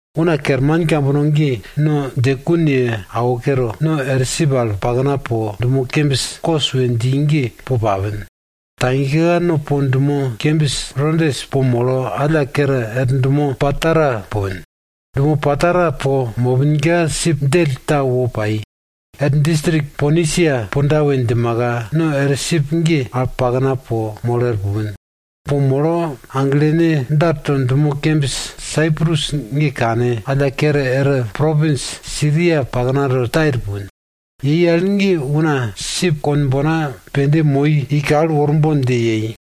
Una kerman kambono ge no djekun ye awo kere, no er sip al pakna po dumo kembis Kos we dji ge po papin. Tagika no po dumo kembis Rodes po molo alla kere er dumo Patara pupin. Dumo Patara po mopinka sip djell ta wo pai. Er distrik Ponisia punda we djimaka, no er sip ge al pakna po molo er pupin. Po molo aglene darto dumo kembis Saiprus ge kane, alla kere er propins Siria paknato Tair pupin. Yei al ge una sip konbona pende moi i kal worbon dje yei.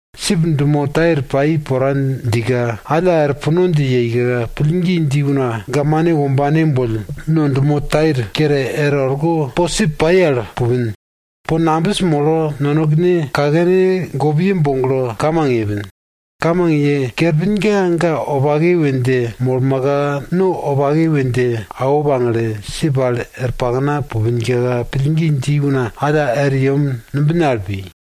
Sip dumo Tair pai pora djika, alla er puno dje yeika, pillgi dji una gamane wombane boll no dumo Tair kere er orko po sip pai al pupin. Po nambis molo, nonekene kakene gopne boglo kamang yepin. Kamang ye kerpinka ga wopake we dje molmaka no wopake we dje awo pagle, sip al er pakna pupinka, pillgi dji una alla er yem numbine al pi.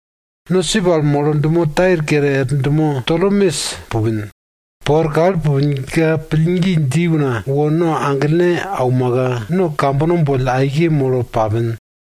No sip al molo dumo Tair kere er dumo Tolemes pupin. Po er kal pupinka pillgi dji una wo no aglene aumaka, no kambono boll aike molo papin.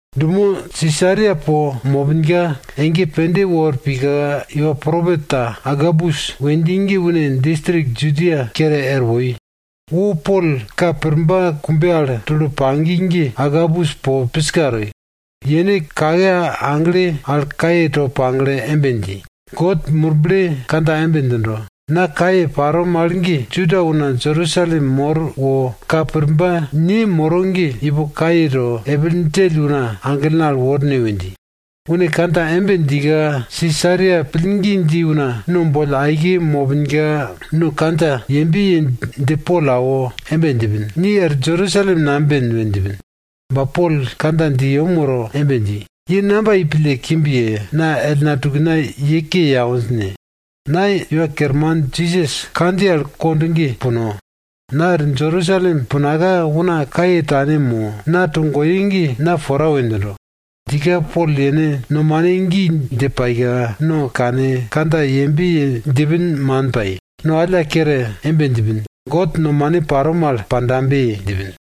Dumo Sisaria po mopinka, ege pende wor pika, iwa propet ta Agabus we dji ge une distrik Judia kere er woi. Wo Pol ka purba kumbe al tulo pagi ge Agabus po piska toi, yene kake agle al kaye to pagle embe dji, God Murble kandja embe djindo, na kaye paro mal ge Juda una Jerusalem mor wo ka purba ne moro ge, ipo kaye to, epil djell una aglene al worne we dji. Une kandja embe djika, Sisaria pillgi dji una no boll aike mopinka, no kandja yembe ye dje Pol awo embe djipin, ni er Jerusalem namben we djipin. Ba Pol kandja dje yem woro embe dji, ye namba yei pille kimb ye, na ellna tukna ye ke ye awinj ne? Na Iwa Kerman Jisas kandjiye al kond ge puno. Na er Jerusalem punaka, una kaye tane mo, na togoye ge na pora we djindo. Djika Pol yene nomane gi dje paika, no kane kandja yembe ye djipin man pai, no alla kere embe djipin, God nomane paro mal pandabe! djipin.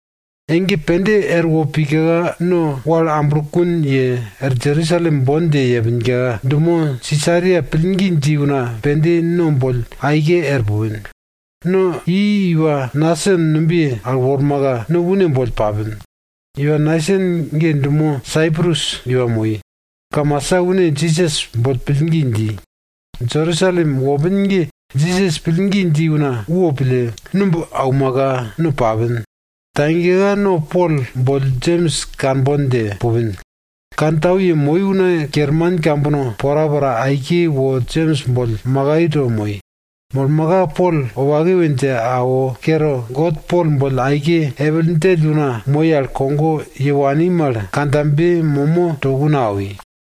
Ege pende erwo pika no wal amblokun ye, er Jerusalem bon dje yepinka, dumo Sisaria pillgi dji una pende no boll aike er pupin. No dje i iwa Nason numbiye al wormaka, no une boll papin. Iwa Nason ge dumo Saiprus iwa moi. Kamasa une Jisas boll pillgi dji. Jerusalem wopin ge Jisas pillgi dji una wo pille, numb aumaka no papin. Tagika no Pol boll Jems kanbon dje pupin. Kantau yemoi una kerman kambono porapora aike wo Jems boll makai to moi. Molmaka Pol wopake we dje awo kere, God Pol boll aike epil djell una moi al kogo ye wani mal kandjabe momo to una awi.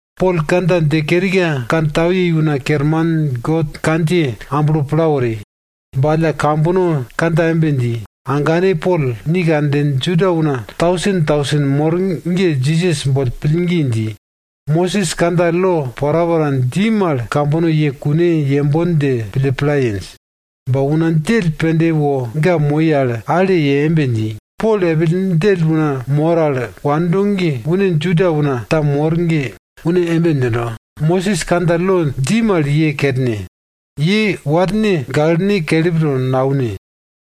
Pol kandja dje kerika, kantau yei una kerman God kandjiye amblo pla wori. Ba alla kambono kandja embe dji, agane Pol, ni kanden Juda una tausen tausen mor ge Jisas boll pillgi dji. Mosis kandja lo porapora dji mal kambono ye kune yembon dje pille pla yenj. Ba una djell pende wo ga moi al ale ye embe dji, Pol epil djell una mor al wando ge une Juda una ta mor ge une embe djindo, Mosis kandja lo dji mal ye kerne. Ye warne gaklene kelip to naune.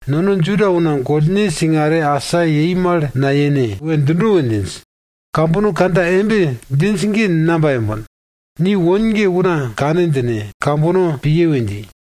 Nono Juda una gollne singare asa yei mal nayene we djindo we djinj. Kambono kandja embe djinj ge namba yembon? Ni won ge una kane djine, kambono piye we dji.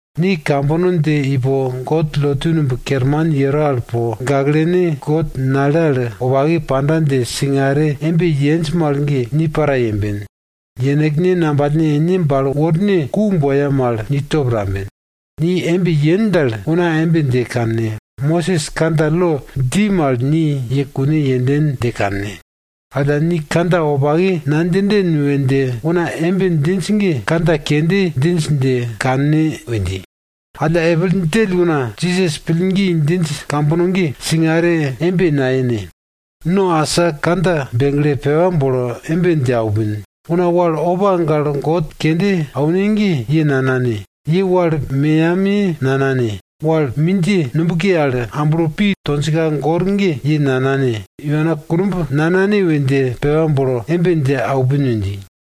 Ni kambono dje ipo God lotu numb kerman yero al po, gaklene God nale al wopake panda dje singare embe yenj mal ge, ni para yemben. Yenekne ngambalne ene bale worne ku boya mal ni top tamben. Ni embe yen dal, una embe dje kanne. Mosis kandja lo dji mal ni ye kune yenden dje kanne. Alla ni kandja wopake nadjinden we dje una embe djinj ge, kandja kende djinj dje kanne we dji. Alla epil djell una Jisas pillgi djinj kambono ge singare embe nayene. No asa kandja begle, pepa bolo embe dje aupin. Una wal opa gale god kende aune ge, ye nanane, ye wal meyamiye nanane, wal mindjiye nubke al amblo pi tonjka gor ge, ye nanane, iwana kunumb nanane we dje pepa bolo embe dje aupin we dji.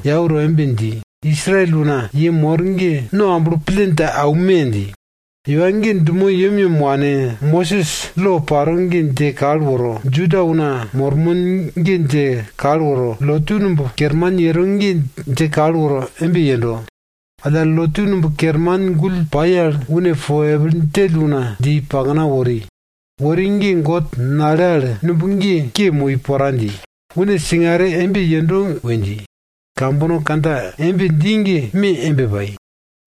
yau to embe dji, Israel una ye mor ge, no amblo pille dje aume! dji. Iwa ge dumo yemyem wane, Mosis lo paro ge dje kal woro, Juda una mormon ge dje kal woro, lotu numb kerman yero ge dje kal woro embe yendo. Alla lotu numb kerman gull pai al une po epil djell una dje i pakna wori. Wori ge God nale al numb ge ke moi pora dji, une singare embe yendo we dji. Kambono kandja embe dji ge me embe pai.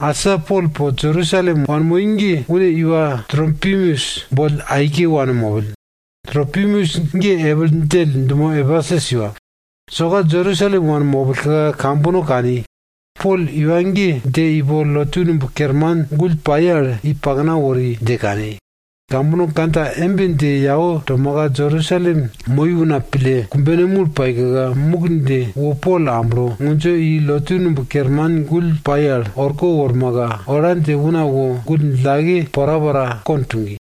Asa Pol po Jerusalem wanmoi ge une iwa Tropimus boll aike wanmopill. Tropimus ge epil djell dumo Epesus iwa. Soka Jerusalem wanmopillka, kambono kani. Pol iwa ge dje ipo lotu numb kerman gull pai al i pakna wori dje kani. Kambono kandja embe dje yau tomaka Jerusalem moi una pille kumbene mul paika, muk dje wo Pol amblo, ngundjo i lotu numb kerman gull pai al orko wormaka, ola dje una wo gull djillake porapora kond tugi.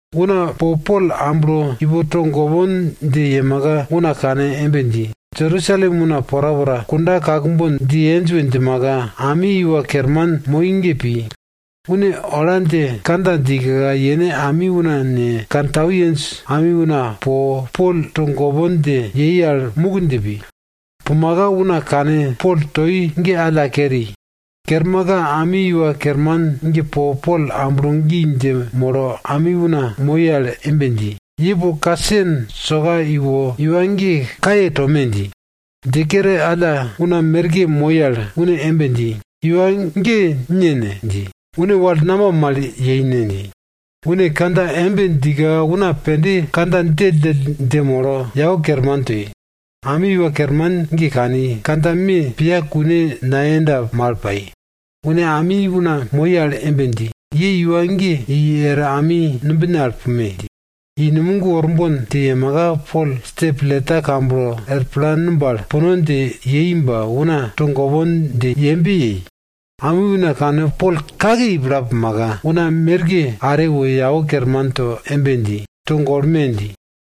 Una po Pol amblo ipo togopon dje yemaka, una kane embe dji, Jerusalem una porapora kunda kakbon dje yenj we djimaka, ami iwa kerman moi ge pi. Une ola dje kandja djika, yene ami una ne, kantau yenj ami una po, Pol togopon dje yei al muk dje pi. Pumaka, una kane Pol toi ge alla keri. Kermaka ami iwa kerman ge po Pol amblo gi dje molo ami una moi al embe dji, ye po kasen soka iwo iwa ge kaye tome dji. Dje kere alla una merke moi al une embe dji, iwa ge ne ne? dji. Une wal namba mal yei ne? dji. Une kandja embe djika una pende kandja djelldjell dje molo, yau kerman toi. Ami iwa kerman ge kani, kandja me piya kune nayenda mal pai, une ami una moi al embe dji, ye iwa ge i er ami numbine al pume! dji. I numog worbon dje yemaka, Pol stepleta kamblo er pla numb al puno dje yei ba una togopon dje yembe yei. Ami una kane Pol kake i pla pumaka, una merke are wo yau kerman to embe dji, togolme! dji.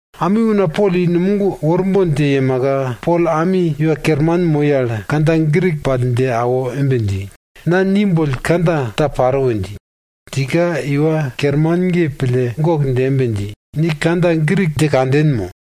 Ami una Pol i numog worbon dje yemaka, Pol ami iwa kerman moi al kandja Grik pall dje awo embe dji, na ni boll kandja ta paro we dji. Djika iwa kerman ge pille gok dje embe dji, ni kandja Grik dje kanden mo?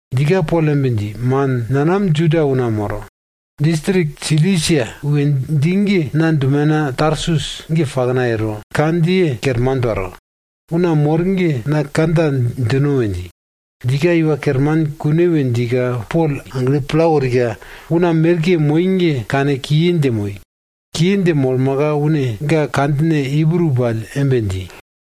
Djika Pol embe dji, man, nanam Juda una moro. Distrik Silisia we dji ge na dumena Tarsus ge pakna yero, kandjiye kerman paro. Una mor ge na kandja djino we dji. Djika iwa kerman kune we djika, Pol agle pla worika, una merke moi ge kane kiye dje moi. Kiye dje molmaka, une ga kandjine Ibru pall embe dji,